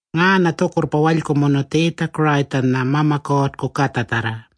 Ngaanya tjukurrpa walykumunu Tjiitja-Kurayitjanya Mama Kuurrku Katjatjarra.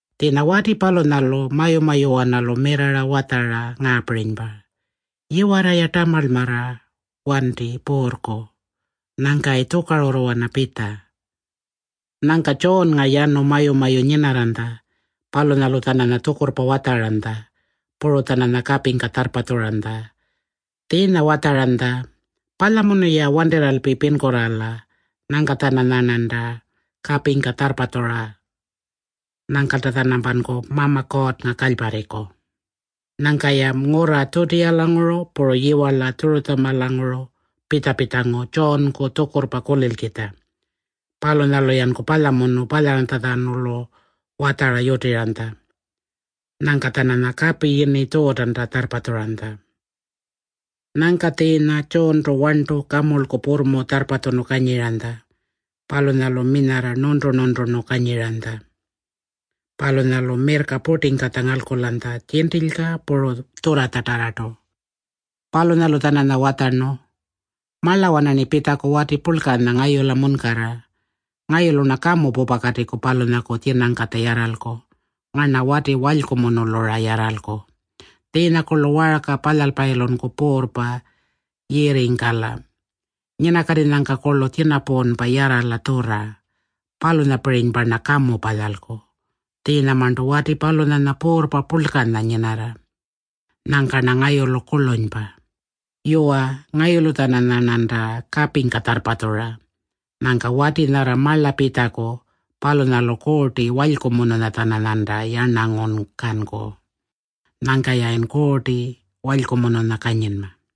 Tjiinya wati palunyalu mayu-mayuwanalu mirrarra watjara ngaapirinypa, ‘Yiwarra-ya tamarlmarra wanti Puurrku. Nyangkayi tjukarurruwana pitja.’” Nyangka Tjuunnga yanu mayu-mayu nyinarranytja. Palunyalu-tjananya tjukurrpa watjaranytja. Puru-tjananya kapingka tjarrpatjuranytja. Tjiinya watjaranytja, “Palyamunu-ya wantirralpi pinkurraala. Nyangka-tjananyarnanta kapingka tjarrpatjurra. Nyangkalta-tjanampanku Mama Kuurrnga kalyparriku.” Nyangka-ya ngurra Tjutiyalanguru puru yiwarla Tjurutjamalanguru pitja-pitjangu Tjuunku tjukurrpa kulilkitja. Palunyalu-yanku palyamunu palyaranytjatjanulu watjara yutiranytja. Nyangka-tjananya kapi yini Tjuutanta tjarrpatjuranytja. Nyangka tjiinya Tjuuntu warntu kamurlku purrmu tjarrpatjunu kanyiranytja. Palunyalu minyarra nuntu-nunturnu kanyiranytja. Palunyalu mirrka purtingkatja ngalkulanytja tjintilyka puru tjurratjatarrartu. Palunyalu-tjananya watjarnu, “Marlawana-rni pitjaku wati purlkanya ngayula munkarra. Ngayulu-rna kamu pupakatiku palunyaku tjinangkatja yarralku. Ngarna wati walykumunulu-ra yarralku. Tjiinyakurlu waarka palyalpayilunku puurrpa yirringkala. Nyinakatinyangkakurlu tjinapuunpa yarrala tjurra. Palunyapirinypa-rna kamu palyalku. Tjiinyamarntu wati palunyanya puurrpa purlkanya nyinarra. Nyangka-rna ngayulu kurlunypa. Yuwa, ngayulu-tjananyarnanta kapingka tjarrpatjura. Nyangka wati nyarra marla pitjaku, palunyalu Kuurti Walykumununya-tjananyanta yarnangungkanku. Nyangka-yayin Kuurti Walykumununya kanyinma.”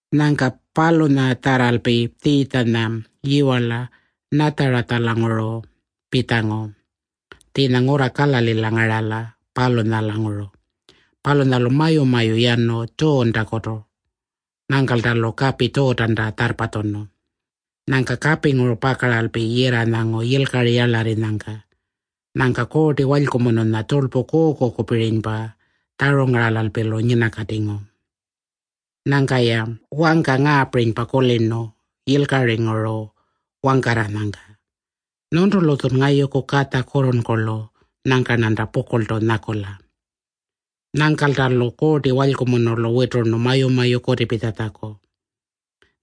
Nyangka palunyatjarralpi Tjiitjanya yiwarla Natjarilanguru pitjangu, tjiinya ngurra Kalalila ngarala, palunyalanguru. Palunyalu mayu-mayu yanu Tjuuntakutu. Nyangkalta-lu kapi Tjuutanta tjarrpatjunu. Nyangka kapinguru pakaralpi yirranyangu yilkari yarlarrinyangka. Nyangka Kuurti Walykumununya tjurlpu kuukukupirinypa tjarungaralalpi-lu nyinakatingu. Nyangka-ya wangka ngaapirinypa kulirnu yilkaringuru wangkarranyangka, “Nyuntulu-tjun ngayuku Katja kurrurnkurlu. Nyangka-rnanta pukurltu nyakula.” Nyangkalta-lu Kuurti Walykumunulu witurnu mayu-mayu kutipitjatjaku.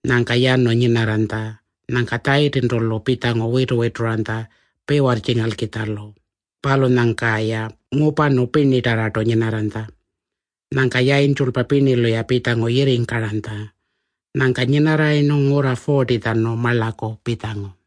Nyangka yanu nyinarranytja. Nyangka Tjayitintu-lu pitjangu witu-wituranytja piwarrtjingalkitjalu. Palunyangka-ya ngupanu pirnitarrartu nyinarranytja. Nyangka yayintjulpa pirnilu-ya pitjangu yirringkaranytja. Nyangka nyinarrayirnu ngurra 40-tjanu marlaku pitjangu.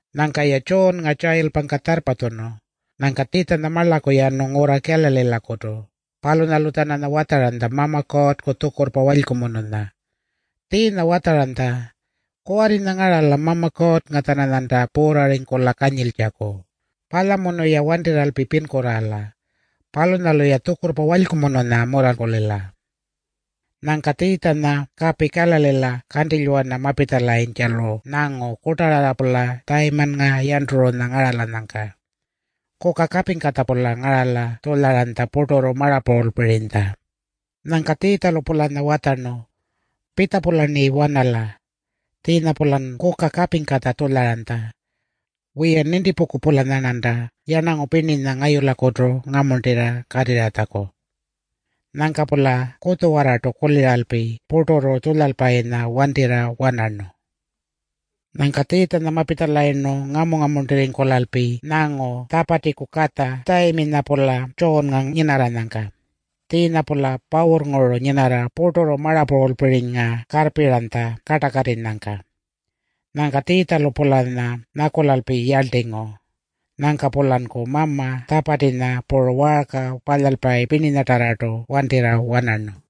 Nyangka-ya Tjuunnga tjayilpangka tjarrpatjunu. Nyangka Tjiitjanya marlaku yanu ngurra Kalalilakutu. Palunyalu-tjananya watjaranytja Mama Kuurrku tjukurrpa walykumununya. Tjiinya watjaranytja, “Kuwarrinya ngarala Mama Kuurrnga-tjananyanta puurrarringkula kanyiltjaku. Palyamunu-ya wantirralpi pinkurraala. Palunyalu-ya tjukurrpa walykumununya mularrkulila.” Nyangka Tjiitjanya kapi Kalalila kantilywana mapitjalayintjalu nyangu kurtararra-pula Tjayimannga Yanturunya ngaralanyangka. Kuka kapingkatja-pula ngarala tjulyaranytja purturru marapuulpirinytja. Nyangka Tjiitjalu-pulanya watjarnu, “Pitja-pularni wanala. Tjiinya-pulan kuka kapingkatja tjulyaranytja. Wiya, nintipungku-pulanyarnanta yarnangu pirninya ngayulakutu ngamuntira katirratjaku.” Nyangka-pula kutjuwarrartu kuliralpi purturru tjulyalpayinya wantirra wanarnu. Nyangka Tjiitjanya mapitjalayirnu ngamu-ngamuntirringkulalpi nyangu Tjapatiku katja Tjayiminya-pula Tjuunnga nyinarranyangka. Tjiinya-pula pawurrnguru nyinarra purturru marapuulpirinynga karrpiranytja kartakatinyangka. Nyangka Tjiitjalu-pulanya nyakulalpi yarltingu. Nyangka-pulanku mama Tjapatinya puru waarka palyalpayi pirninyatarrartu wantirra wanarnu.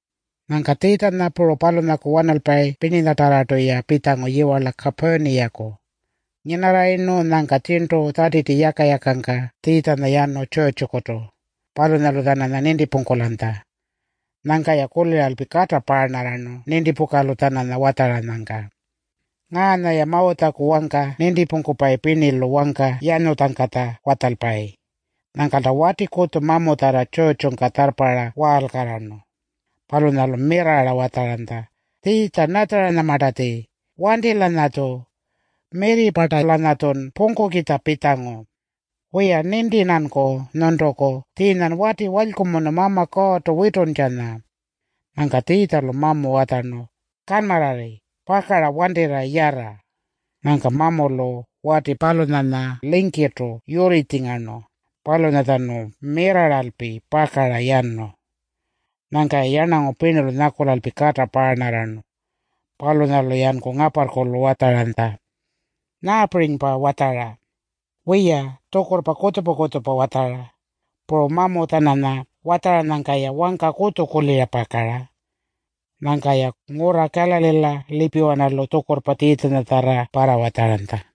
Nyangka Tjiitjanya puru palunyaku wanalpayi pirninyatarrartu-ya pitjangu yiwarla Kapurniyaku. Nyinarrayirnu, nyangka tjirntu Tjatiti yaka-yakangka Tjiitjanya yanu tjurrtjukutu. Palunyalu-tjananya nintipungkulanytja. Nyangka-ya kuliralpi kata paarnarrarnu nintipukalu-tjananya watjaranyangka. Ngaanya-ya Mawutjaku wangka nintipungkupayi pirnilu wangka yanyutjangkatja watjalpayi. Nyangkalta wati kutju mamutjarra tjurrtjungka tjarrparra waalkarrarnu. Palunyalu mirrarra watjaranytja, “Tjiitja-Natjarinyamartatji, wanti-lanyatju. Mirri-parta-lanyatjun pungkukitja pitjangu? Wiya, ninti-rnanku nyuntuku. Tjiinyan wati walykumunu Mama Kuurrtu wituntjanya.” Nyangka Tjiitjalu mamu watjarnu, “Kanmarrarri. Pakara wantirra yarra.” Nyangka mamulu wati palunyanya lingkirrtu yurritjingarnu. Palunyatjanu mirrarralpi pakara yanu. Nyangka-ya yarnangu pirnilu nyakulalpi kata paarnarrarnu. Palunyalu-yanku ngaparrkulu watjaranytja, “Nyaapirinypa watjara? Wiya, tjukurrpa kutjupa-kutjupa watjara. Puru mamu-tjananya watjaranyangka-ya wangka kutju kulira pakara.” Nyangka-ya ngurra Kalalila lipiwanalu tjukurrpa Tjiitjanyatjarra parrawatjaranytja.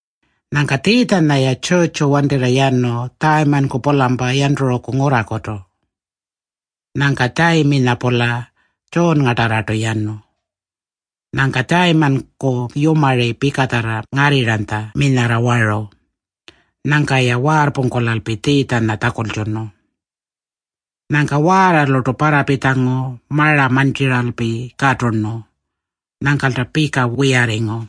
Nyangka Tjiitjanya-ya tjurrtju wantirra yanu Tjayimanku-pulampa Yanturuku ngurrakutu. Nyangka Tjayiminya-pula Tjuunngatarrartu yanu. Nyangka Tjayimanku yumari pikatjarra ngarrirranytja minyarra waru. Nyangka-ya waarrpungkulalpi Tjiitjanya tjakultjunu. Nyangka waarralurtu parrapitjangu mara mantjiralpi katurnu. Nyangkalta pika wiyarringu.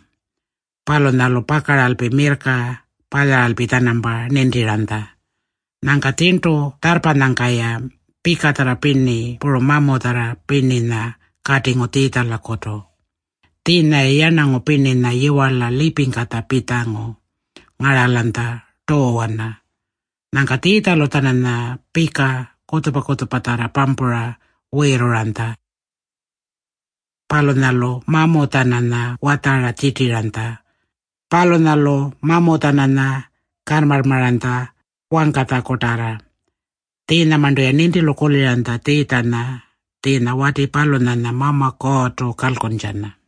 Palunyalu pakaralpi mirrka palyaralpi-tjanampa nintiranytja. Nyangka tjirntu tjarrpanyangka-ya pikatjarra pirni puru mamutjarra pirninya katingu Tjiitjalakutu. Tjiinya-ya yarnangu pirninya yiwarla lipingkatja pitjangu ngaralanytja tuuwana. Nyangka Tjiitjalu-tjananya pika kutjupa-kutjupatjarra pampura wiirruranytja. Palunyalu mamu-tjananya watjara tjirtiranytja. Palunyalu mamu-tjananya kanmarrmaranytja wangkatjakutarra. Tjiinyamarntu-ya nintilu kuliranytja Tjiitjanya tjiinya wati palunyanya Mama Kuurrtu kalkuntjanya.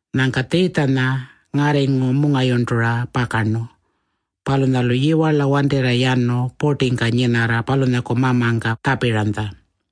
Nyangka Tjiitjanya ngarringu mungayurntura pakarnu. Palunyalu yiwarla wantirra yanu purtingka nyinarra palunyaku Mamangka tjapiranytja.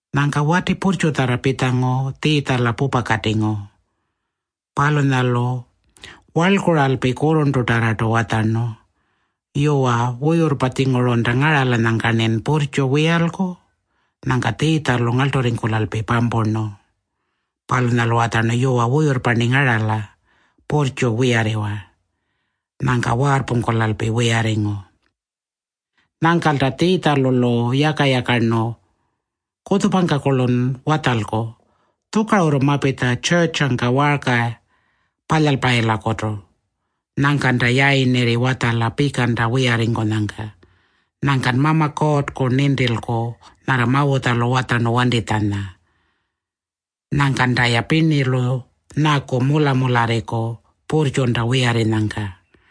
Nyangka wati purrtjutjarra pitjangu Tjiitjala pupakatingu. Palunyalu warlkuralpi kurrurntutarrartu watjarnu, “Yuwa, wuyurrpa-tjingurunta ngaralanyangka-rnin purrtju wiyalku.” Nyangka Tjiitjalu ngarlturringkulalpi pampurnu. Palunyalu watjarnu, “Yuwa, wuyurrpa-rni ngarala. Purrtju, wiyarriwa.” Nyangka waarrpungkulalpi wiyarringu. Nyangkalta Tjiitjalu-lu yaka-yakarnu, “Kutjupangka-kurlun watjalku. Tjukarurru mapitja tjurrtjungka waarka palyalpayilakutu. Nyangkanta yayirnirri watjala pikanta wiyarrinyangka. Nyangkan Mama Kuurrku nintilku nyarra Mawutjalu watjarnu wantitjanya. Nyangkanta-ya pirnilu nyaku mula-mularriku purrtjunta wiyarrinyangka.”